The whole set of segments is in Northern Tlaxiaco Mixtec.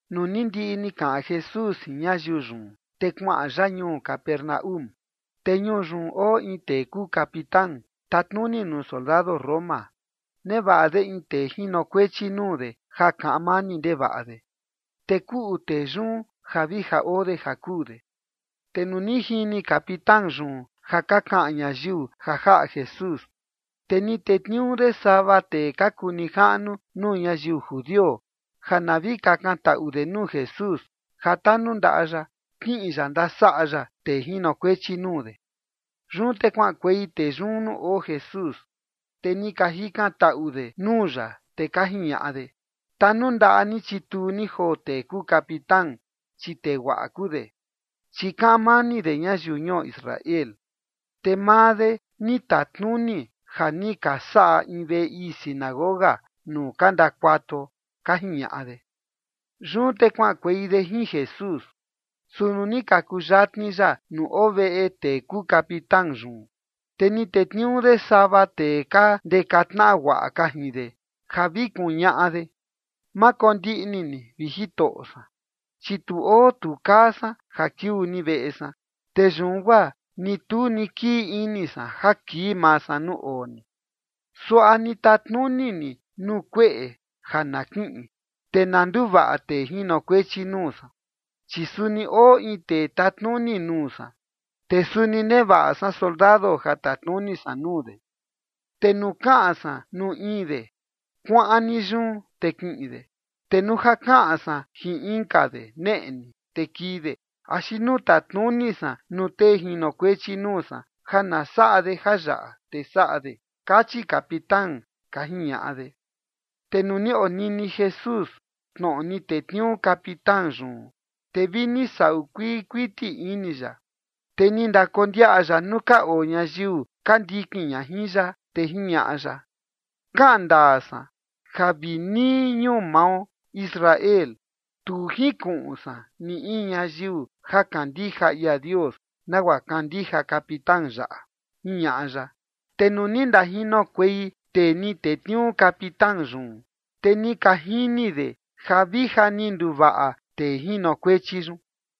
Nuu ni ndiꞌi ni kaꞌan Jesús jin ñayiu yun, te kuaꞌan ya ñuu Capernaúm. Te ñuu yun oo in tee kuu capitán tatnuni de nuu soldado Roma, nevaꞌa de in tee jinokuechi nuu de ja kaꞌan mani ndevaꞌa de, te kuꞌu tee yun ja vi ja oo de ja kuu de. Te nuu ni jini capitán yun ja ka kaꞌan ñayiu ja jaꞌa Jesús, te ni tetniuu de sava tee ka kuu nijaꞌnu nuu ñayiu judio ja na vi kakantaꞌu de nuu Jesús ja tanundaꞌa ya kiꞌin ya ndasaꞌa ya tee jinokuechi nuu de. Yun te kuaꞌankuei tee yun nuu oo Jesús, te ni ka jikantaꞌu de nuu ya, te ka jiñaꞌa de: ―Tanundaꞌa ni chituu ni joo tee kuu capitán, chi tee guaꞌa kuu de, chi kaꞌan mani de ñayiu ñuo Israel, te maa de ni tatnuni ja ni ka saꞌa in veꞌe ii sinagoga nuu ka ndakuatuo ―ka jiñaꞌa de. Yun te kuaꞌankuei de jin Jesús. Su nuu ni ka kuyatni ya nuu oo veꞌe tee kuu capitán yun, te ni tetniuu de sava tee ka ndeka tnaꞌa guaꞌa ka jin de ja vi kuñaꞌa de: ―Ma kondiꞌni ni, vi Jitoꞌo san, chi tu oo tu kaa san ja kiuu ni veꞌe san. Te yun guaa ni tu ni kii ini san ja kii maa san nuu oo ni. Suaꞌa ni tatnuni ni nuu kueꞌe ja na kiꞌin, te na nduvaꞌa tee jinokuechi nuu san. Chi suni oo in tee tatnuni nuu san, te suni nevaꞌa san soldado ja tatnuni san nuu de. Te nuu kaꞌan san nuu in de “kuaꞌan ni yun”, te kiꞌin de. Te nuu ja kaꞌan san jin inka de “neꞌe ni”, te kii de. Axi nuu tatnuni san nuu tee jinokuechi nuu san ja na saꞌa de jayaꞌa, te saꞌa de, kachi capitán ―ka jiñaꞌa de. Te nuu ni onini Jesús tnoꞌo ni tetniuu capitán yun, te vi ni saꞌu kuii kuiti ini ya, te ni ndakondiaꞌa ya nuu ka oo ñayiu ka ndikin ña jin ya, te jiñaꞌa ya: ―Kaꞌan ndaa san ja vi nii ñuu mao Israel tu jinkuꞌun san ni in ñayiu ja kandija ia Dios nagua kandija capitán yaꞌa ―jiñaꞌa ya. Te nuu ni ndajinokuei tee ni tetniuu capitán yun, te ni ka jini de ja vi ja ni nduvaꞌa tee jinokuechi yun.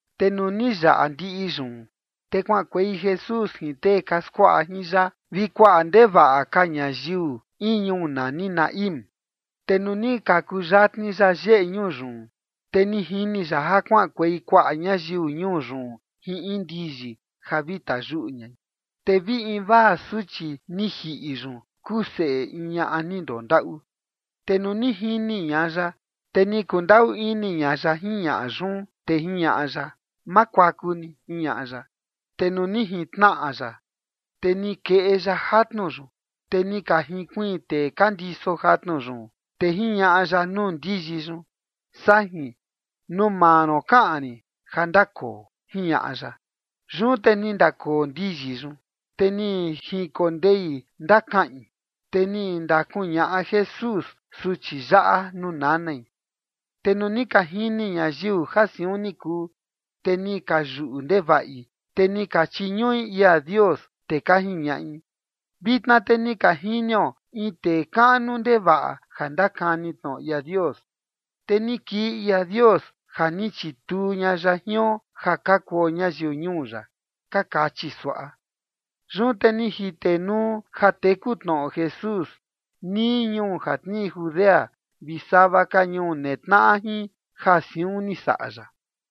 Te nuu ni yaꞌa ndiꞌi yun, te kuaꞌankuei Jesús jin tee ka skuaꞌa jin ya vi kuaꞌa ndevaꞌa ka ñayiu in ñuu nani Naín. Te nuu ni ka kuyatni ya yeꞌe ñuu yun, te ni jini ya ja kuaꞌankuei kuaꞌa ñayiu ñuu yun jin in ndiyi ja vi tayuꞌu ñai. Te vi invaa suchi ni jiꞌi yun kuu seꞌe in ñaꞌa ni ndondaꞌu. Te nuu ni jini ña ya, te ni kundaꞌu ini ña ya jin ñaꞌa yun, te jiñaꞌa ya: ―Ma kuaku ni ―jiñaꞌa ya. Te nuu ni jintnaꞌa ya, te ni keꞌe ya jatnu yun, te ni ka jinkuiin tee ka ndiso jatnu yun. Te jiñaꞌa ya nuu ndiyi yun: ―Sajin, nuu maa ron kaꞌan rin ja ndakoo ―jiñaꞌa ya. Yun te ni ndakoo ndiyi yun, te ni jinkondei ndakaꞌin. Te ni ndakuñaꞌa Jesús suchi yaꞌa nuu nanai. Te nuu ni ka jini ñayiu ja siun ni kuu, te ni ka yuꞌu ndevaꞌi, te ni ka chiñuꞌi ia Dios, te ka jiñaꞌi: ―Vitna te ni ka jinio in tee kaꞌnu ndevaꞌa ja ndakani tnoꞌo ia Dios. Te ni kii ia Dios ja ni chituu ña ya jion ja ka kuo ñayiu ñuu ya ―ka kachi suaꞌa. Yun te ni jitenuu ja teku tnoꞌo Jesús nii ñuu ja tnii Judea vi sava ka ñuu netnaꞌa jin ja siun ni saꞌa ya.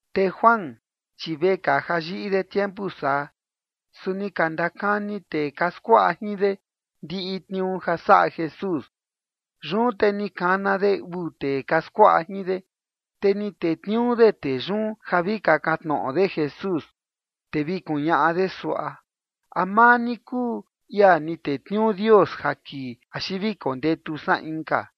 Te Juan chi vekaa ja yiꞌi de tiempu saa, su ni ka ndakani tee ka skuaꞌa jin de ndiꞌi tniuu ja saꞌa Jesús. Yun te ni kana de uu tee ka skuaꞌa jin de, te ni tetniuu de tee yun ja vi kakan tnoꞌo de Jesús, te vi kuñaꞌa de suaꞌa: “¿A maa ni kuu ia ni tetniuu Dios ja kii, axi vi kondetu san inka?”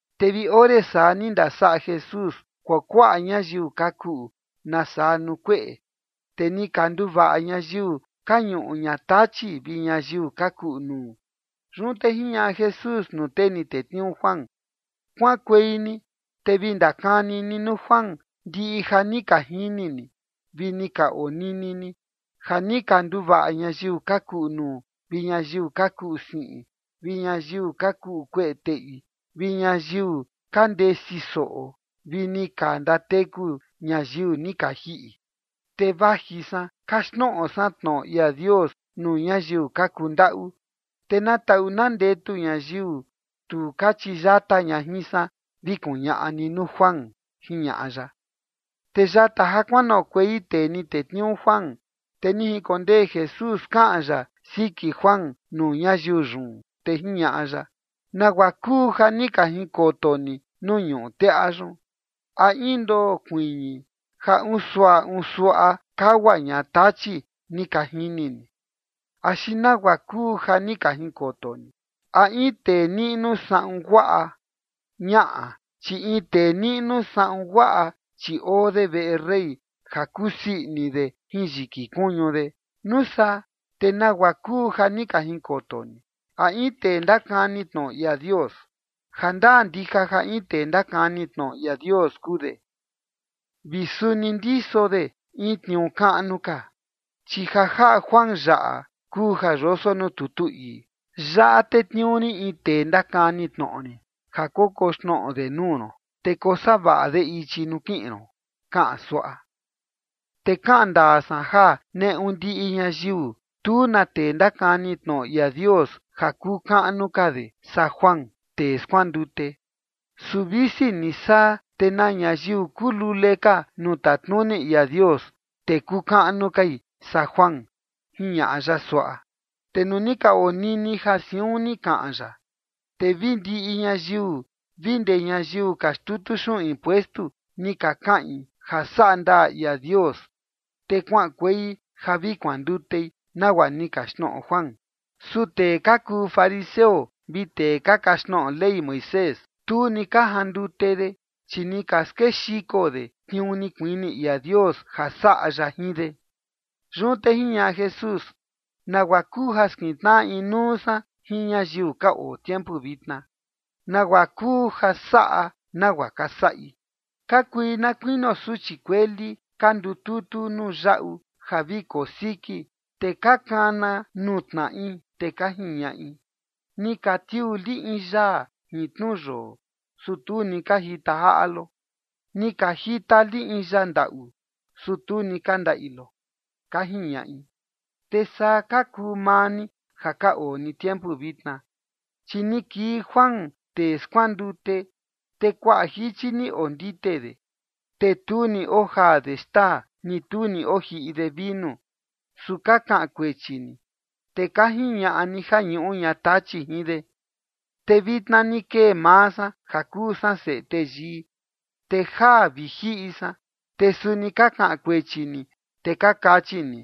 Te vi ore saa ni ndasaꞌa Jesús kuakuaꞌa ñayiu ka kuꞌu nasaa nuu kueꞌe, te ni ka nduvaꞌa ñayiu ka ñuꞌu ña tachi vi ñayiu ka kuꞌu nuu. Yun te jiñaꞌa Jesús nuu tee ni tetniuu Juan: ―Kuaꞌankuei ni te vi ndakani ni nuu Juan ndiꞌi ja ni ka jini ni vi ni ka onini ni, ja ni ka nduvaꞌa ñayiu ka kuꞌu nuu, vi ñayiu ka kuꞌu siꞌin, vi ñayiu ka kuꞌu kueꞌe teꞌi, vi ñayiu ka ndesi soꞌo vi ni ka ndateku ñayiu ni ka jiꞌi. Te vaji san kaxtnoꞌo san tnoꞌo ia Dios nuu ñayiu ka kundaꞌu. Te na taꞌu na ndetu ñayiu tu ka chiyata ña jin san, vi kuñaꞌa ni nuu Juan ―jiñaꞌa ya. Te yata ja kuanoꞌokuei tee ni tetniuu Juan, te ni jinkondee Jesús kaꞌan ya siki Juan nuu ñayiu yun, te jiñaꞌa ya: ―¿Nagua kuu ja ni ka jinkoto ni nuu ñuꞌu teꞌa yun? ¿A in ndoo kuiñi ja unsuaꞌa unsuaꞌa kagua ña tachi ni ka jini ni? ¿Axi nagua kuu ja ni ka jinkoto ni? ¿A in tee niꞌnu saꞌun guaꞌa? Ñaꞌa, chi in tee niꞌnu saꞌun guaꞌa, chi oo de veꞌe rey ja kusii ini de jin yiki kuñu de. Nusaa ¿te nagua kuu ja ni ka jinkoto ni? ¿A in tee ndakani tnoꞌo ia Dios? Ja ndaa ndija ja in tee ndakani tnoꞌo ia Dios kuu de, vi suni ndiso de in tniuu kaꞌnu ka. Chi ja jaꞌa Juan yaꞌa kuu ja yoso nuu tutu ii: Yaꞌa tetniuu rin in tee ndakani tnoꞌo rin ja kokoxnoꞌo de nuu ron, te kosavaꞌa de ichi nuu kiꞌin ron kaꞌan suaꞌa. ’Te kaꞌan ndaa san ja neꞌu ndiꞌi ñayiu, tu na tee ndakani tnoꞌo ia Dios ja kuu kaꞌnu ka de saa Juan, tee skuandute. Su visi ni saa, te na ñayiu kuu lule ka nuu tatnuni ia Dios, te kuu kaꞌnu kai saa Juan ―jiñaꞌa ya suaꞌa. Te nuu ni ka onini ja siun ni kaꞌan ya, te vi ndiꞌi ñayiu vi ndee ñayiu ka xtutu xuꞌun impuestu ni ka kaꞌin ja saꞌa ndaa ia Dios, te kuaꞌankuei ja vi kuandutei, nagua ni kaxtnoꞌo Juan. Su tee ka kuu fariseo vi tee ka kaxtnoꞌo Ley Moisés, tu ni ka jandute de, chi ni ka skexiko de tniuu ni kuini ia Dios ja saꞌa ya jin de. Yun te jiñaꞌa Jesús: ―¿Nagua kuu ja skintnaꞌa inuu san jin ñayiu ka oo tiempu vitna? ¿Nagua kuu ja saꞌa nagua ka saꞌi? Ka kui na kuinio suchi kueli ka ndututu nuu yaꞌu ja vi kosiki, te ka kana nuu tnaꞌi, te ka jiñaꞌi: “Ni ka tiuu li in yaa jin tnu yoo, su tu ni ka jita jaꞌa lo. Ni ka jita li in yaa ndaꞌu, su tu ni ka ndaꞌi lo”, ka jiñaꞌi. Te saa ka kuu maa ni ja ka oo ni tiempu vitna. Chi ni kii Juan, tee skuandute, te kuaꞌa jichi ni ondite de, te tu ni ojaa de xtaa ni tu ni ojiꞌi de vinu. Su ka kaꞌan kuechi ni, te ka jiñaꞌa ni ja ñuꞌu ña tachi jin de. Te vitna ni kee maa san ja kuu san Seꞌe Teyii, te jaa vi jiꞌi san, te suni ka kaꞌan kuechi ni, te ka kachi ni: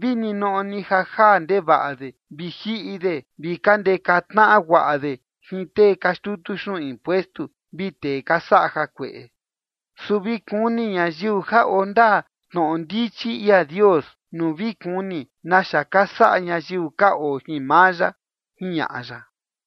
“Vi ninoꞌo ni ja jaa ndevaꞌa de vi jiꞌi de vi ka ndeka tnaꞌa guaꞌa de jin tee ka xtutu xuꞌun impuestu vi tee ka saꞌa jakueꞌe”. Su vi kuni ñayiu ja oo ndaa tnoꞌo ndichi ia Dios nuu vi kuni naxa ka saꞌa ñayiu ka oo jin maa ya ―jiñaꞌa ya.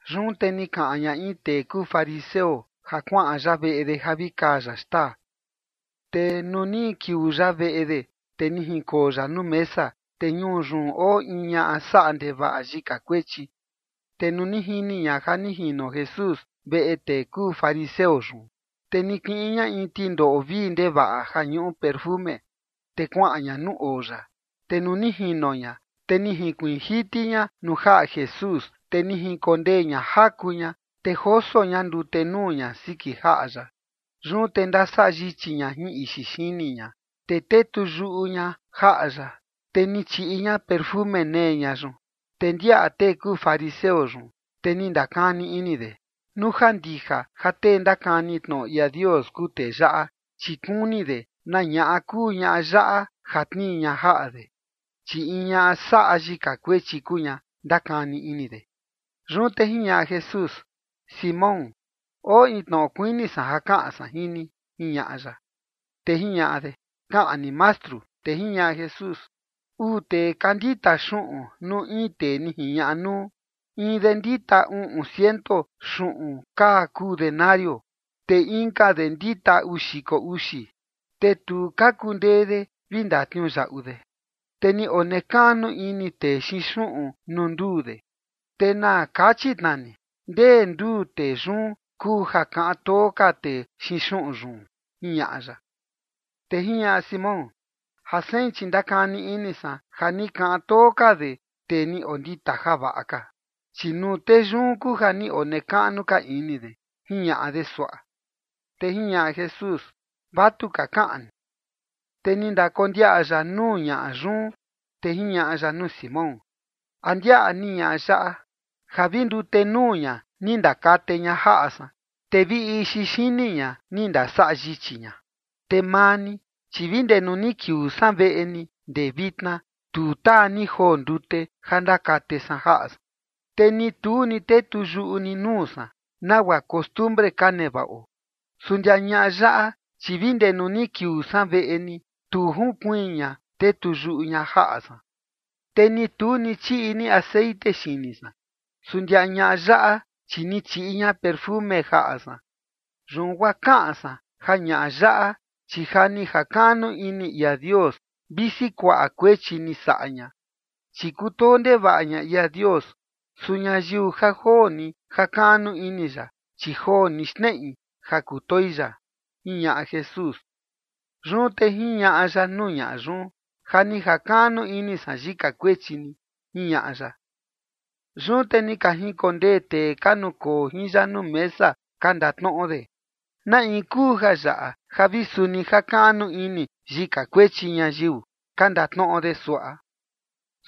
Yun te ni kaꞌan ña in tee kuu fariseo ja kuaꞌan ya veꞌe de ja vi kaa ya xtaa. Te nuu ni kiuu ya veꞌe de, te ni jinkoo ya nuu mesa. Te ñuu yun oo in ñaꞌa saꞌa ndevaꞌa yika kuechi. Te nuu ni jini ña ja ni jino Jesús veꞌe tee kuu fariseo yun, te ni kiꞌin ña in tindoꞌo vii ndevaꞌa ja ñuꞌu tatna xiko, te kuaꞌan ña nuu oo ya. Te nuu ni jino ña, te ni jinkuiin jiti ña nuu jaꞌa Jesús, te ni jinkondee ña jaku ña, te joso ña ndute nuu ña siki jaꞌa ya. Yun te ndasaꞌa yichi ña jin ixi xini ña, te tetuyuꞌu ña jaꞌa ya, te ni chiꞌi ña tatna xiko nee ña yun. Te ndiaꞌa tee kuu fariseo yun, te ni ndakani ini de: “Nuu ja ndija ja tee ndakani tnoꞌo ia Dios kuu tee yaꞌa, chi kuni de na ñaꞌa kuu ñaꞌa yaꞌa ja tnii ña jaꞌa de, chi in ñaꞌa saꞌa yika kuechi kuu ña”, ndakani ini de. Yun te jiñaꞌa Jesús: ―Simón, oo in tnoꞌo kuini san ja kaꞌan san jin ni ―jiñaꞌa ya. Te jiñaꞌa de: ―Kaꞌan ni, Mastru. Te jiñaꞌa Jesús: ―Uu tee ka ndita xuꞌun nuu in tee ni jiñaꞌa nuu. In de ndita uꞌun ciento xuꞌun kaa kuu denario, te inka de ndita uu xiko uxi. Te tu ka kundee de vi ndatniuyaꞌu de, te ni onekaꞌnu ini tee xiin xuꞌun nuu nduu de. Te na kachi tnaa ni, ¿ndee nduu tee yun kuu ja kaꞌan too ka tee xiin xuꞌun yun? ―jiñaꞌa ya. Te jiñaꞌa Simón: ―Ja sein, chi ndakani ini san ja ni kaꞌan too ka de tee ni ondita javaꞌa ka, chi nuu tee yun kuu ja ni onekaꞌnu ka ini de ―jiñaꞌa de suaꞌa. Te jiñaꞌa Jesús: ―Vatuka kaꞌan ni. Te ni ndakondiaꞌa ya nuu ñaꞌa yun, te jiñaꞌa ya nuu Simón: ―¿A ndiaꞌa ni ñaꞌa yaꞌa? Ja vi ndute nuu ña ni ndakate ña jaꞌa san, te vi ixi xini ña ni ndasaꞌa yichi ña. Te maa ni, chi vi ndee nuu ni kiuu san veꞌe ni ndee vitna, tu taa ni joo ndute ja ndakate san jaꞌa san. Te ni tu ni tetuyuꞌu ni nuu san, nagua costumbre ka nevaꞌo. Su ndia ñaꞌa yaꞌa, chi vi ndee nuu ni kiuu san veꞌe ni, tu jinkuiin ña tetuyuꞌu ña jaꞌa san. Te ni tu ni chiꞌi ni texeꞌen xini san. Su ndia ñaꞌa yaꞌa, chi ni chiꞌi ña tatna xiko jaꞌa san. Yun guaa kaꞌan san ja ñaꞌa yaꞌa, chi ja ni jakaꞌnu ini ia Dios visi kuaꞌa kuechi ni saꞌa ña, chi kutoo ndevaꞌa ña ia Dios. Su ñayiu ja joo ni jakaꞌnu ini ya, chi joo ni xneꞌi ja kutoi ya ―jiñaꞌa Jesús. Yun te jiñaꞌa ya nuu ñaꞌa yun: ―Ja ni jakaꞌnu ini san yika kuechi ni ―jiñaꞌa ya. Yun te ni ka jinkondee tee ka nukoo jin ya nuu mesa ka ndatnoꞌo de: ―¿Na in kuu jayaꞌa ja vi suni jakaꞌnu ini yika kuechi ñayiu? ―ka ndatnoꞌo de suaꞌa.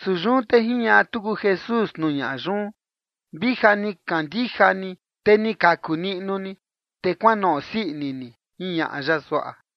Su yun te jiñaꞌa tuku Jesús nuu ñaꞌa yun: ―Vi ja ni kandija ni, te ni kaku niꞌnu ni. Te kuanoꞌo sii ini ni ―jiñaꞌa ya suaꞌa.